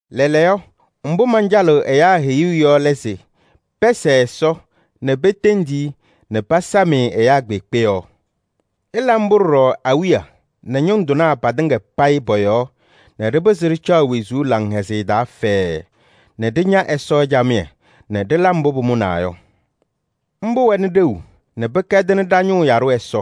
Lɛɛlɛɛyɔ, mbʋ mancalɩɣ ɛyaa heyuu yɔ lɛ se: pɛsɛɛ Ɛsɔ nɛ petendi-i nɛ pasam-ɩ ɛyaa kpeekpe yɔɔ. Ɩla mbʋ ɖɔɖɔ awiya nɛ ñʋŋ tɩnaa patɩŋa payɩ pɔ-yɔɔ nɛ ɖɩpɩzɩ ɖɩcaɣ wezuu laŋhɛzɩyɛ taa fɛɛɛ nɛ ɖɩña Ɛsɔ camɩyɛ nɛ ɖɩla mbʋ pʋmʋnaa yɔ. Mbʋ wɛnɩ ɖeu nɛ pɩkɛdɩnɩ ɖa-ñʋʋ yaɖʋ Ɛsɔ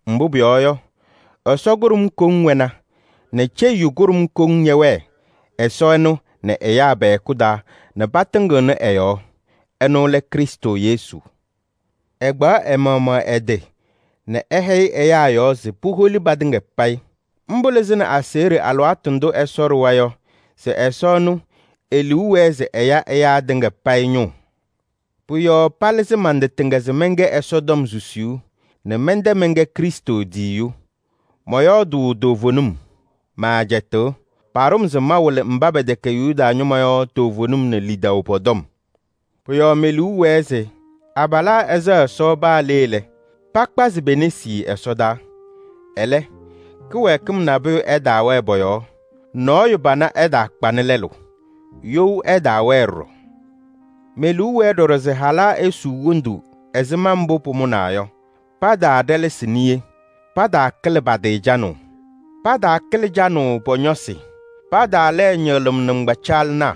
Mbʋ pʋyɔɔ yɔ, Ɛsɔ kʋɖʋm koŋ wɛna nɛ ceyiyu kʋɖʋm koŋ ñɛwɛɛ Ɛsɔ ɛnʋ nɛ ɛyaa pɛ-hɛkʋ taa nɛ patɩŋɩɣnɩ ɛ-yɔɔ. Ɛnʋ lɛ Krɩstʋ Yesu. Ɛkpaɣ ɛ-maɣmaɣ ɛ-tɩ nɛ ɛhɛyɩ ɛyaa yɔɔ se puholi patɩŋa payɩ: mbʋ lɩzɩnɩ aseɣɖe alɩwaatʋ ndʋ Ɛsɔ ɖʋwa yɔ se Ɛsɔ ɛnʋ e-liu wɛɛ se ɛya ɛyaa tɩŋa payɩ ñʋʋ. Pʋ-yɔɔ palɩzɩ man-tɩ tɩŋa se mɛnkɛ Ɛsɔtɔm susiyu nɛ mɛntɛ mɛnkɛ Krɩstʋ tiyiyu. Mɔyɔɔdʋʋ toovenim, maacɛtɩɣ. Paɖʋ-m se mawɩlɩ mba pɛtɛkɛ Yuda ñɩma yɔ toovenim nɛ lidaʋ pɔ-tɔm. Pʋ-yɔɔ me-liu wɛɛ se abalaa ɛsɛɣ Ɛsɔ paa le lɛ, pakpazɩ pe-nesi ɛsɔdaa. Ɛlɛ kɩwɛɛkɩm nabʋyʋ ɛtaawɛɛ pɔ-yɔɔ. Nɔɔyʋ pana ɛtaakpanɩ lɛlʋ, you ɛtaawɛɛ ɖɔɖɔ. Me-liu wɛɛ ɖɔɖɔ se halaa esuu wondu ɛzɩma mbʋ pʋmʋnaa yɔ, pataaɖɛlɛsɩ niye, pataakɩlɩ pa-tɩ canʋʋ. Pataakɩlɩ canʋʋ pɔ-ñɔsɩ, pataalɛɛ ñɩɣlɩm nɩŋgbacaɣlɩnaa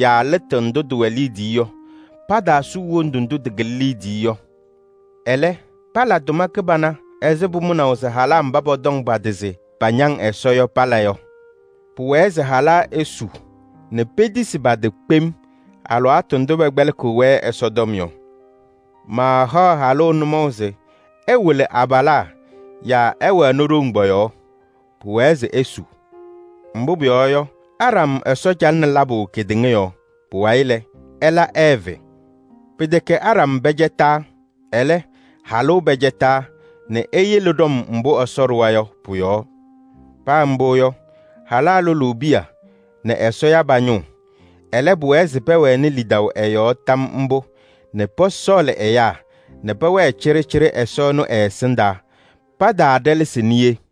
yaa lɩtʋ ndʋ tɩwɛ liidiye yɔ, pataasuu wondu ndʋ tɩkɩlɩ liidiye yɔ. Ɛlɛ, pala tʋma kɩbana ɛzɩ pʋmʋnaʋ se halaa mba pɔtɔŋ pa-tɩ se pañaŋ Ɛsɔ yɔ pala yɔ. Pʋwɛɛ se halaa esu nɛ petisi pa-tɩ kpem alɩwaatʋ ndʋ pɛkpɛlɩkɩɣ-wɛ Ɛsɔtɔm yɔ. Maahaɣ halʋ nʋmɔʋ se ɛwɩlɩ abalaa yaa ɛwɛnɩ ɖoŋ pɔ-yɔɔ. Pʋwɛɛ se esu. Mbʋ pʋyɔɔ yɔ, Aɖam Ɛsɔ calɩnɩ labʋ kedeŋa yɔɔ. Pʋwayɩ lɛ, ɛla Ɛɛvɩ. Pɩtɛkɛ Aɖam pɛcɛtaa, ɛlɛ, halʋ pɛcɛtaa nɛ eyele ɖɔm mbʋ Ɛsɔ ɖʋwa yɔ pʋ-yɔɔ. Paa mbʋ yɔ, halaa lʋlʋʋ piya nɛ Ɛsɔ ya pa-ñʋʋ. Ɛlɛ, pʋwɛɛ se pɛwɛnɩ lidaʋ ɛ-yɔɔ tam mbʋ nɛ pɔsɔɔlɩ ɛyaa nɛ pɛwɛɛ cɩɖɩcɩɖɩ Ɛsɔ ɛnʋ ɛ-ɛsɩndaa. Pataaɖɛlɛsɩ niye.